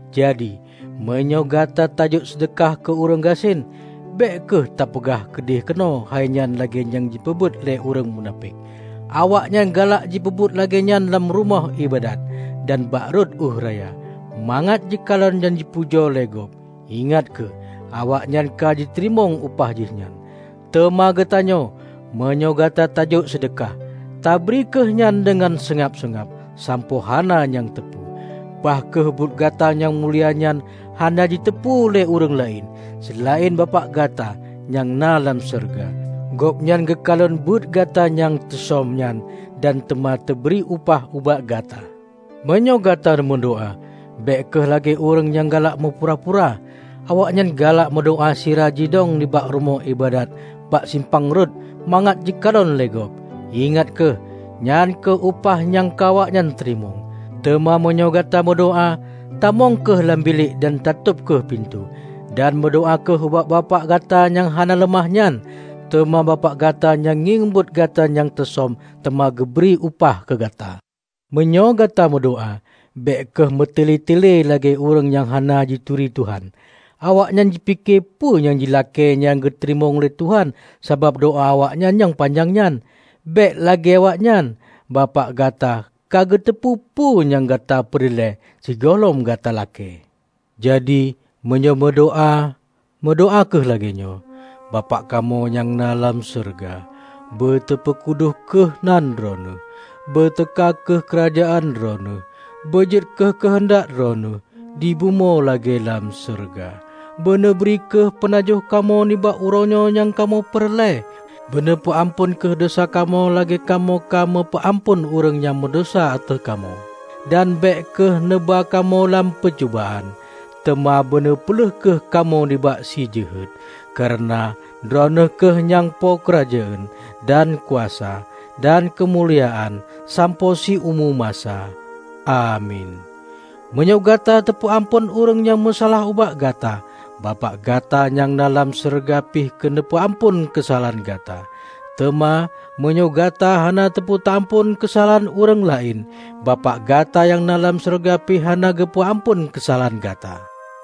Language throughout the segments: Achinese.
Jadi, meunyoe gata tajok seudeukah keu ureuëng gasien, bék kheueh tapeugah keudeh-keunoe hai nyan lagée nyang jipeubuet lé ureuëng munafék. Awaknyan galak jipeubuet lagée nyan lam rumoh iébadat dan bak rot ueh raya, mangat jikalon dan jipujoe lé gob. Ingat kheueh, awaknyan ka jiteurimong upah jihnyan. Teuma gatanyoe, meunyoe gata tajok seudeukah, tabri kheueh nyan deungon seungab-seungab, sampoe hana nyang teupeu. Bah kheueh buet gata nyang mulia nyan hana jiteupeu lé ureuëng laén, seulaén Bapak gata nyang na lam syeuruga. Gobnyan geukalon buet gata nyang teusöm nyan dan teuma teubri upah ubak gata." "Meunyoe gata nemeudoá, bék kheueh lagée ureuëng nyang galak meupura-pura. Awaknyan galak meudoá sira jidong nibak rumoh iébadat bak simpang rot mangat jikalon lé gob. Ingat kheueh, nyan kheueh upah nyang ka awaknyan teurimong. Teuma meunyoe gata meudoá, tamong kheueh lam bilék dan tatôb kheueh pintoe, dan meudoá kheueh ubak Bapak gata nyang hana leumah nyan. Teuma Bapak gata nyang ngieng buet gata nyang teusöm teuma geubri upah keu gata. Meunyoe gata meudoá, bék kheueh meutelée-telée lagée ureuëng nyang hana jituri Tuhan. Awaknyan jipike peue nyang jilakée nyan geuteurimong lé Tuhan sabab doá awaknyan nyang panyang nyan. Bék lagée awaknyan. Bapak gata ka geuteupeue peue nyang gata peureulée, sigohlom gata lakée. Jadi meunyoe meudoá-meudoá kheueh lagée nyoe, Bapak kamoe nyang na dalam syeuruga: Beuteupeu kudus kheueh nan Droeneueh, beuteuka kheueh keurajeuen Droeneueh, beujeuet kheueh keuheundak Droeneueh, dibumoe lagée lam syeuruga. Beuneubri kheueh peunajoh kamoe nibak uroenyoe nyang kamoe peureulée. Beuneupeu amphon kheueh desya kamoe lagée kamoe ka meu peuamphon ureuëng nyang meudesya ateueh kamoe. Dan bék kheueh neuba kamoe lam peucubaan, teuma beuneu peulheueh kheueh kamoe nibak si Jeuhet. Kareuna Droeneueh kheueh nyang po keurajeuen, dan kuasa dan keumuliaan sampoe siumu masa. Amin. Meunyoe gata tapeuamphon ureuëng nyang meusalah ubak gata, Bapak gata nyang na lam syeuruga pih geupeu-amphon keusalahan gata. Teuma meunyoe gata hana tapeuamphon keusalahan ureuëng laén, Bapak gata nyang na lam syeuruga pih hana geupeu-amphon keusalahan gata."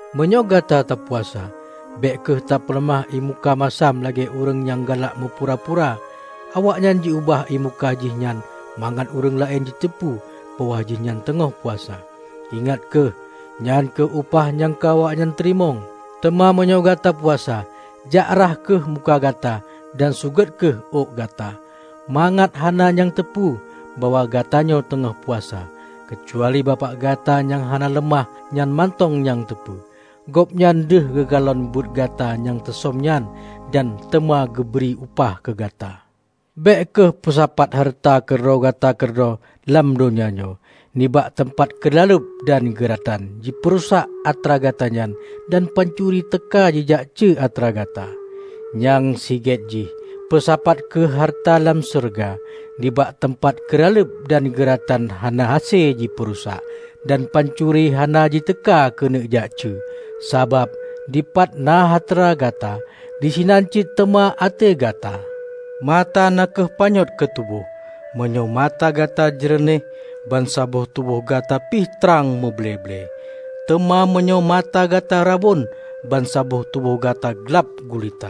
"Meunyoe gata tapuasa, bék kheueh tapeuleumah ié muka masam lagée ureuëng nyang galak meupura-pura. Awaknyan ji-ubah ié muka jih nyan mangat ureuëng laén jiteupeu bahwa jih nyan teungoh puasa. Ingat kheueh, nyan kheueh upah nyang ka awaknyan teurimong. Teuma meunyoe gata puasa, jak rhah kheueh muka gata dan sugot kheueh ôk gata, mangat hana nyang teupeu bahwa gatanyoe teungoh puasa, keucuali Bapak gata nyang hana leumah nyan mantong nyang teupeu. Gobnyan deuh geukalon buet gata nyang teusöm nyan dan teuma geubri upah keu gata." "Bék kheueh peusapat hareuta keu droe gata keudroe lam donya nyoe, nibak teumpat keuraleueb dan geuratan jipeurusak atra gata nyan dan pancuri teuka jijak cue atra gata. Nyang sigét jih, peusapat kheueh hareuta lam syeuruga, nibak teumpat keuraleueb dan geuratan hana hase jipeurusak, dan pancuri hana jiteuka keuneuk jak cue. Sabab, dipat na hareuta gata, disinan cit teuma até gata!" "Mata na kheueh panyöt keu tuboh. Meunyoe mata gata jeureunéh, bansaboh tuboh gata pih trang muble-ble. Teuma meunyoe mata gata rabon, ban saboh tuboh gata glab gulita.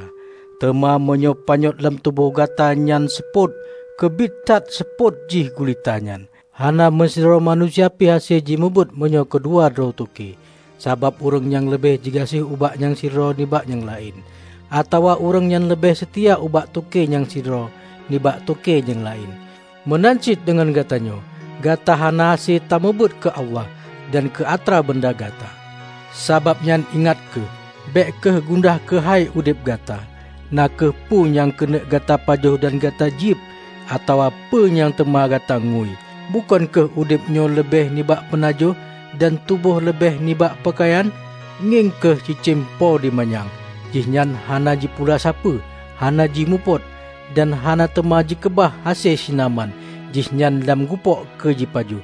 Teuma meunyoe panyöt lam tuboh gata nyan seupôt, keubiet that seupôt jih gulita nyan!" "Hana meusidroe manusia pih hase jimeubuet meunyoe keu dua droe toke. Sabab ureuëng nyang leubeh jigaséh ubak nyang sidroe nibak nyang laén. Atawa ureuëng nyan leubeh seutia ubak toke nyang sidroe nibak toke nyang laén. Meunan cit deungon gatanyoe. Gata hana hase tameubuet keu Allah dan keu atra beunda gata. Sabab nyan ingat kheueh; bék kheueh gundah keuhai udeb gata, na kheueh peue nyang keuneuk gata pajoh dan gata jieb, atawa peue nyang teuma gata ngui. Bukon kheueh udeb nyoe leubeh nibak peunajoh, dan tuboh leubeh nibak peukayan? Ngieng kheueh cicém po di manyang. Jihnyan hana jipula sapeue, hana jimupot, dan hana teuma jikeubah hase sinaman jihnyan lam gupôk keu jipajoh.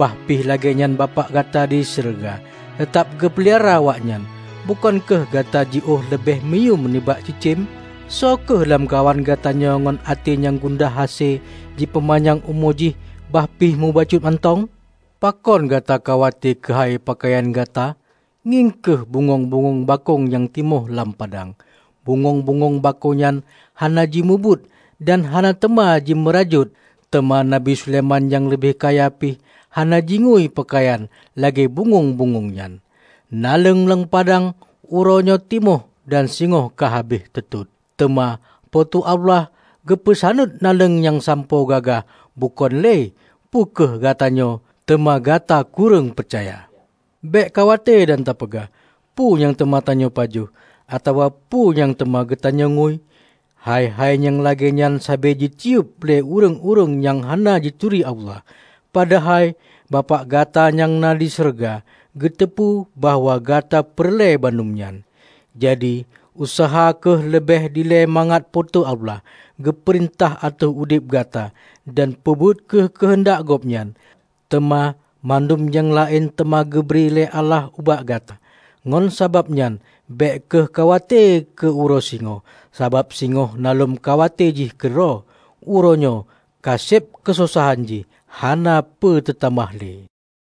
Bahpih lagée nyan Bapak gata di syeuruga teutab geupeulara awaknyan! Bukon kheueh gata jiôh leubeh meuyuem nibak cicém? Soe kheueh lamkawan gatanyoe ngon até nyang gundah hase jipeupanyang umu jih bahpih mubacut mantong? Pakon gata khawate keuhai peukayan gata? Ngieng kheueh bungöng-bungöng bakong nyang timoh lam padang. Bungöng-bungöng nyan hana jimubuet dan hana teuma jimeurajôt; teuma Nabi Sulaiman nyang leubeh kaya pih, hana jingui peukayan lagée bungöng-bungöng nyan! Naleueng lam padang uroe nyoe timoh dan singoh ka habéh teutot. Teuma Po teu Allah geupeusaneut naleueng nyan sampoe gagah bukon lé. Peu kheueh gatanyoe! Teuma gata kureueng peucaya! Bék khawate dan tapeugah, 'Peue nyang teuma tanyoe pajoh,' atawa 'peue nyang teuma geutanyoe ngui'? Hai-hai nyang lagée nyan sabe jitiyeub lé ureuëng-ureuëng nyang hana jituri Allah. Padahai Bapak gata nyang di syeuruga geuteupeue bahwa gata peureulée bandum nyan. Jadi, useuha kheueh leubeh dilée mangat Po teu Allah geupeurintah ateueh udeb gata dan peubuet kheueh keuheundak Gobnyan. Teuma mandum nyang laén teuma geubri lé Allah ubak gata. Ngon sabab nyan, bék kheueh khawate keu uroe singoh. Sabab singoh na lom khawate jih keudroe. Uroe nyoe ka seb keusosahan jih, hana peu teutamah lé."